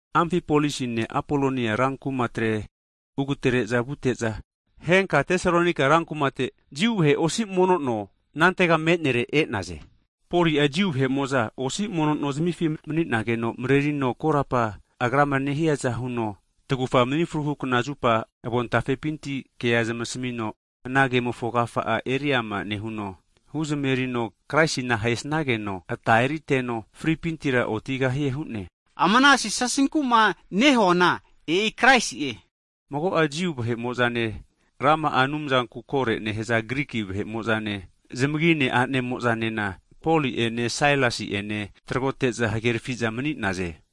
Amfipolisine Apoloniane ran kumatre ugatere'za vute'za, henka Tesalonaika rankumate Jiu vahe osi mono no (sinagog) anantega menere e'naze. Poli'a Jiu vahe'mo'za osi mono nozmifi mani'nageno marerino, korapa agrama nehiaza huno, tagufa mni fruhu kna (Sabat) zupa avontafepinti kea zamasmino, ana kemofo agafa'a eriama nehuno huzamerino, Kraisina ahesnageno ata eriteno fripintira otigahie hu'ne. Ama ana Jisasinku'ma nehuana e'i Kraisi'e. Mago'a Jiu vahe'mo'zane, rama'a Anumzanku koro nehaza Griki vahe'mo'zane, zamagine a'nemo'zanena Poline Sailasi ene tragote'za hagerafi'za mani'naze.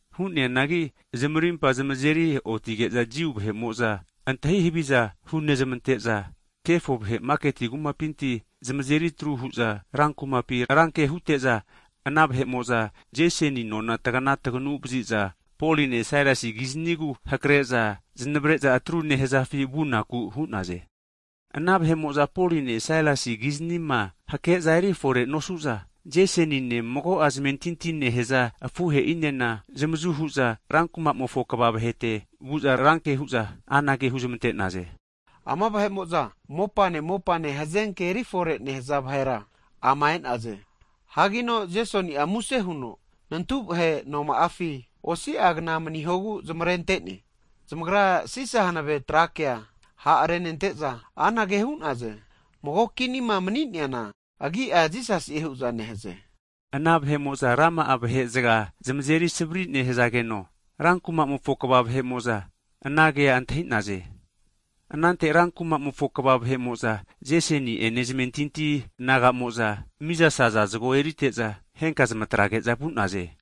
Hu'neanagi zamarimpa zamazeri otige'za Jiu vahe'mo'za antahi haviza hunezmante'za, kanivere'za kefo vahe maketi kumapi zamazeritru hu'za, ran kumapi ranke hute'za ana vahe'mo'za Jasoni nona tagana taganu vazi'za, Poline Sailasi kiznigu hake'za zanavre'za atru nehazafi vunaku hu'naze. Ana vahe'mo'za Poline Sailasi kizanima hake'za erifore nosu'za, Jasonine, mago'a zamentinti nehaza afuhe'inena zamazu hu'za rankumamofo kva (siti ofisa) vahete vu'za ranke hu'za anage huzmante'naze, ama vahe'mo'za mopane mopane hazenke eri fore nehaza vahera ama e'naze. Hagino Jesoni'a muse huno nantu vahe noma'afi osi'agna manihogu zamarente'ne! Zamagra Sisa hanave tra kea ha' renente'za anage hu'naze, mago kinima mani'neana agi'a Jisasi'e hu'za nehaze! Ana vahe'mo'za rama'a vahe'zga zamazerisavri nehazageno, rankumamofo kva vahe'mo'za ana kea antahi'naze. Anante ran kumamofo kva vahe'mo'za Jesoni ene zamentinti naga'mo'za mizasaza zago erite'za, henka zamatrage'za vu'naze.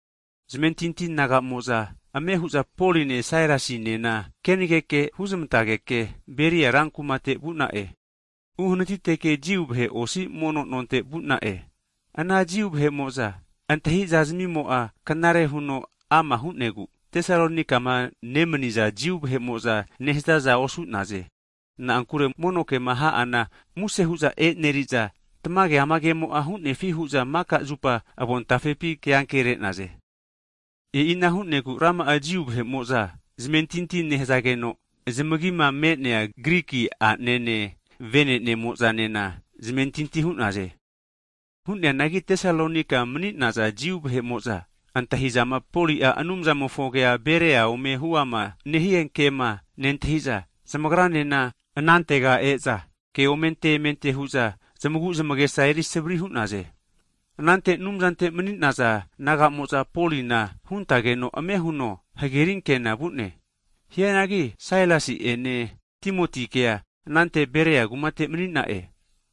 Zamentinti naga'mo'za ame hu'za Poline Sailasinena kenageke huznantage'ke, Beria ran kumate vu'na'e. Uhanatiteke Jiu vahe osi mono nonte vu'na'e. Ana Jiu vahe'mo'za antahi'za zamimo'a knare huno ama hu'negu, Tesalonaikama nemaniza Jiu vahe'mo'za nehazaza osu'naze. Na'ankure mono kema ha'ana muse hu'za eneri'za, tamage amagemo'a hu'nefi hu'za maka zupa avon tafepi ke'ankere'naze. E'ina hu'negu rama'a Jiu vahe'mo'za zamentinti nehazageno, zamagima me'nea Griki a'nene vene'nemo'zanena zamentinti hu'naze. Hu'neanagi Tesalonaika mani'naza Jiu vahe'mo'za antahizama, Poli'a Anumzamofo kea Beria ome huama nehie kema nentahi'za, zamagranena anantega e'za, keomente emente hu'za, zamagu zamagesa eri savari hu'naze. Anante Anumzante mani'naza naga'mo'za, Polina huntageno ame huno hagerinkena vu'ne, hianagi Sailasi'ene Timotikea anante Beria kumate mani'na'e.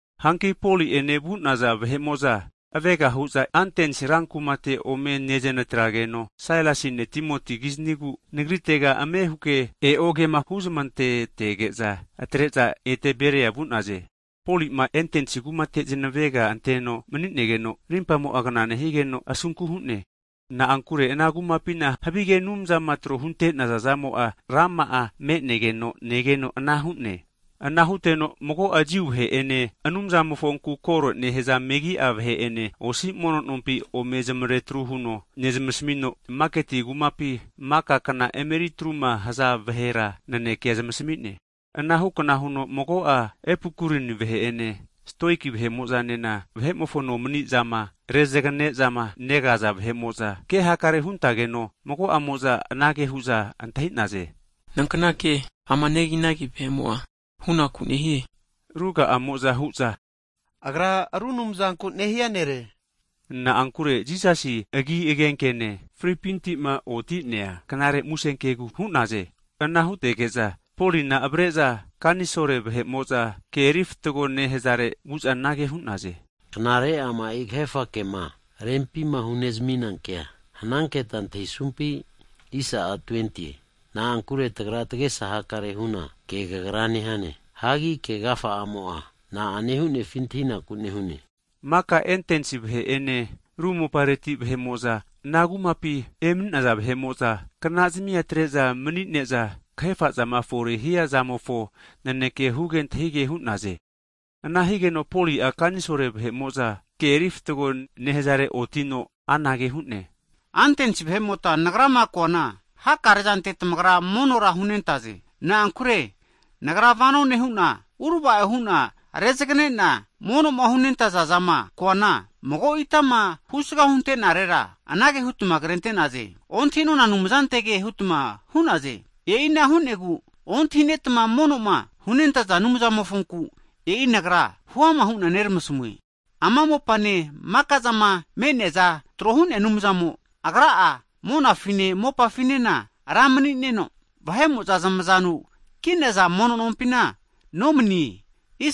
Hanki Poli'ene vu'naza vahe'mo'za, avega hu'za Antens ran kumate ome netrazageno, Sailasine Timoti kiznigu nagritega ame huke e'o kema humazamantetege'za, atre'za ete Beria vu'naze. Poli'ma Atens kumate zanavega anteno mani'negeno, rimpamo'a kna nehigeno asunku hu'ne, na'ankure ana kumapina havige anumza tro'ma hunte'naza'zamo'a, rama'a me'negeno negeno ana hu'ne. Ana huteno mago'a Jiu vahe'ene, Anumzamofonku koro nehaza megi'a vahe'ene osi mono nompi ome zamaretru huno nezamasmino, maketi kumapi maka kna emeri atruma haza vahera nanekea zamasmi'ne. Anahu kna huno mago'a Epikurien vahe'ene, Stoik vahe'mo'zanena vahe'mofo nomani'zama rezagane'zama negaza vahe'mo'za (Filosofa) kehakare hunentageno mago'amo'za anage hu'za antahi'naze, Nankna ke ama neginagi vahe'mo'a hunaku nehie? Ruga'amo'za hu'za, Agra ru anumzanku nehia nere. Na'ankure Jisasi agi agenkene, fripintima oti'nea knare musenkegu hu'naze. Ana hutege'za Polina avareza (areopagus) kanisol vahe'mo'za ke erifatgo nehazare vu'za anage hu'naze, Knare ama'i kahefa kema rempima hunezamina kea hananketa antahisumpi? Na'ankure tagra tagesa hakare huna ke kagra nehane, hagi ke agafa'amo'a na'ane hu'nefi antahinaku nehune. Maka Antens vahe'ene ru mopareti vahe'mo'za ana kumapi emani'naza vahe'mo'za knazimi'a atre'za manine'za kahefa zama fore hia zamofo naneke huge antahige hu'naze. Ana higeno Poli'a kanisol vahe'mo'za ke erifatgo nehazare otino (Areopagus) anage hu'ne, Antens vahe'mota, nagrama koana hakarezante tamagra monora hunentaze. Na'ankure nagra vano nehuna urava'o hu'na rezagane'na monoma hunentaza'zama koana, mago itama (alta) husga huntenarera anage hutma krente'naze, ontahinona Anumzanetege hutma hu'naze. E'ina hu'negu ontahinetma mono'ma hunentaza zamofonku, e'i nagra huama hu'na neramasmue. Ama mopane maka'zama me'neaza tro hu'nea Anumzamo, Agra'a monafine mopafinena Ra mani'neno, vahe'mo'za zamazanu ki'naza mono nompina nomanie.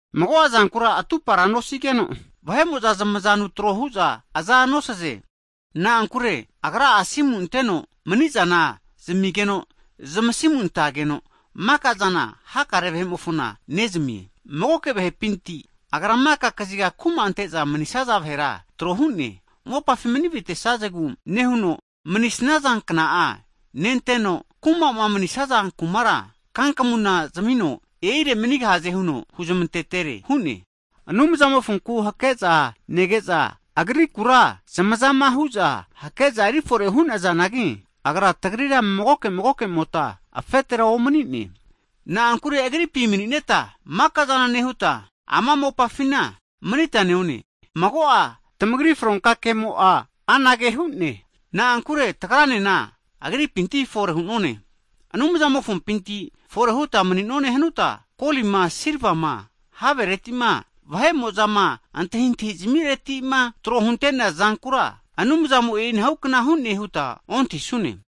Mago'a zankura atupara nosigeno vahe'mo'za zamazanu tro hu'za aza nosaze. Na'ankure agra'a asimu anteno mani'zana zamigeno zamasimu antageno, maka'zana hakare vahe'mofona nezamie. Magoke vahepinti Agra maka kaziga kuma ante'za manisaza vahera tro hu'ne. Mopafi manivitesazegu nehuno, manisnaza kna'a nenteno, kumama manisaza kumara, kankamu zamino e'ire manigahaze huno huzmantetere hu'ne. Anumzamofonku hake'za nege'za, agrikura zamazama hu'za hake'za erifore hu'nazanagi, agra tagrira magoke magokemota afetera omani'ne. Na'ankure agripi manineta mika'zana nehuta, ama mopafina manita neone, mago'a tamagri fronka kemo'a anage hu'ne. Na'ankure tagranena agripinti fore hu'none. Anumzampinti fore huta mani'none hanuta, kolima silvare'ma, havereti'ma vahe'mo'zama antahintahi zamiretima tro huntea zankura Anumzamo e'inahu kna hu'ne huta ontahisune.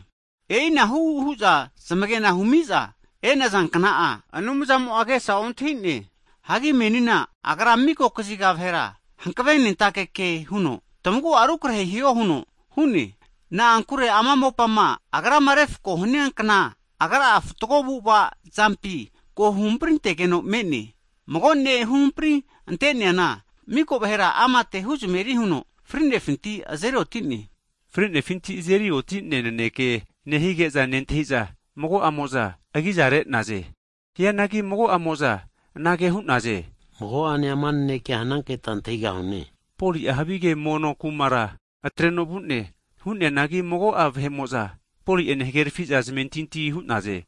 E'inahu hu'za zamagena hu'miza e'naza kna'a, Anumzamo'a agesa ontahi'ne, hagi menina agra miko kaziga vahera hankave nentake ke huno, tamagu'a rukarehe hiho huno hu'ne. Na'ankure ama mopama Agrama refako hania kna, agra'a fatgo avu'ava zampi ko huhampri tegeno me'ne. Mago ne' huhampri ante'neana miko vahera amate huzameri huno fri'nefinti azeri oti'ne. Fri'nefinti azeri oti'nea naneke nehige'za nentahiza, mago'amo'za agiza re'naze. Hianagi mago'amo'za anage hu'naze, mago'ane ama nanekea hananketa antahigahune hu'naze. Poli'a havige mono kumara (Areopagus) atreno vu'ne. Hu'neanagi mago'a vahe'mo'za Poli'ene hagerafi'za zamentinti hu'naze.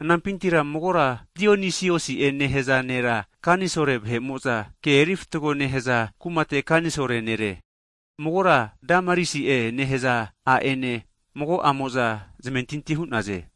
Anampintira magora Dionisiosi'e nehaza nera kanisol vahe'mo'za ke erifatago nehaza kumate kanisol nere, magora Damarisi'e nehaza a'ene mago'amo'za zamentinti hu'naze.